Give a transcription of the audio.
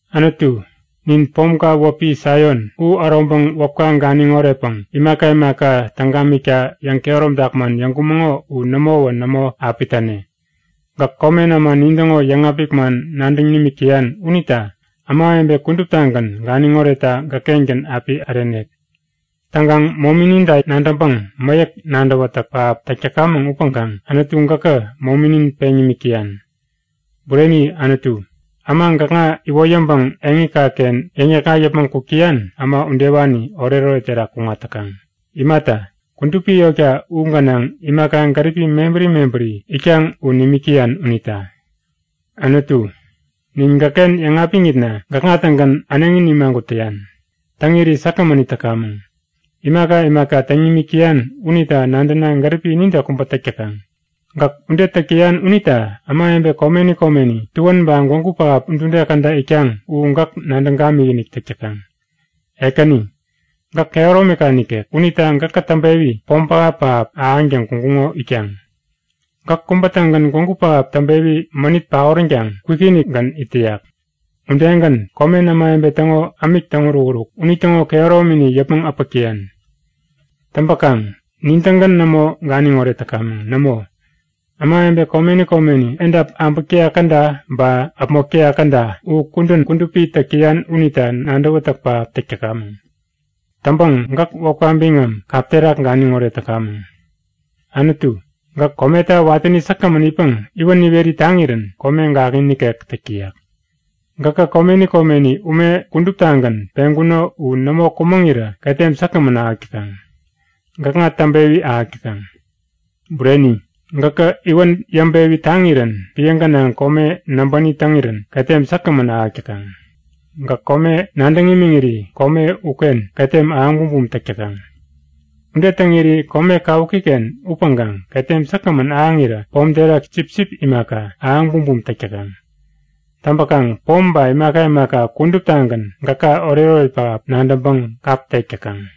Anutu, nin pomka wäpi Saion u äroŋpäŋ wäpka ganiŋ oretpäŋ imaka imaka täŋ gamikta yäŋkehäromtak man yäŋkumäŋo u nämowä nämo api täne. Gäk komen äma nintäŋo yäŋapik man nadäŋ nimik täyan unita ämawebe kuduptagän ganiŋ oretta gäkkengän äpi ärenek. Täŋkaŋ momininta nadäŋpäŋ mäyäk nadäwätäk pähap täk täkamäŋ upäŋkaŋ Anutu gäkä mominin peŋ nimik täyan. Bureni Anutu, äma gäkŋa iwoyäŋpäŋ eŋikaken yäŋ-yäkŋat yäpmäŋ kuk täyan, äma udewani oretoret terak kuŋat täkaŋ. Imata, kudupi yotka u gänaŋ imaka gäripi mebäri mebäri itkaŋ u nimik täyan unita. Anutu, nin gäkken yäŋapiŋitna gäkŋa-tägän äneŋi nimagut täyan. Täŋiri säkgämän it täkamäŋ. Imaka imaka täŋ nimik täyan unita nadäna gäripi inide kubä täk täkaŋ. Gäk ude täk täyan unita ämawebe komeni komeni, tuän ba gwägu pähap udude käda itkaŋ u gäk nadäŋ gamikinik täk täkaŋ. Ekäni, gäk kehäromika nikek. Unita gäkä täŋpewi pom pähap-pähap ahäŋtäŋ kuŋkuŋo itkaŋ. Gäk kubä-tägän gwägu pähap täŋpewi mänit paoränkaŋ kwikinikgän it täyak. Udegän, komen ämawebe täŋo ämik täŋ-urukuruk unitäŋo kehäromini yäpmäŋ äpäk täyan. Täŋpäkaŋ nin-tägän nämo ganiŋoret täkamäŋ. Nämo, ämawebe komeni komeni, edap äbäk täyak käda ba äpmok täyak käda u kudän kudupi täk täyan unita nadäwätäk pähap täk täkamäŋ. Täŋpäŋ gäk wäpka biŋam kap terak ganiŋoret täkamäŋ. Anutu, gäk kometa watäni säkgämän itpäŋ iwän iweri taŋirän kome gakŋi nikek täk täyak. Gäkä komeni komeni ume kuduptagän peŋkuno u nämo kumäŋirä ketem säkgämän ahäk täkaŋ. Gäkŋa täŋpewi ahäk täkaŋ. Bureni, gäkä iwän yäŋpewi taŋirän piä gänaŋ kome näbäni täŋirän ketem säkgämän ahäk täkaŋ. Gäk kome nadäŋ imiŋiri kome uken ketem ahäŋ bumbum täk täkaŋ. Ude täŋiri kome kawukiken upäŋkaŋ ketem säkgämän ahäŋirä pom terak sipsip imaka, ahäŋ bumbum täk täkaŋ. Täŋpäkaŋ pom ba imaka imaka kuduptagän gäka oretoret pähap nadäŋpäŋ kap tek täkaŋ.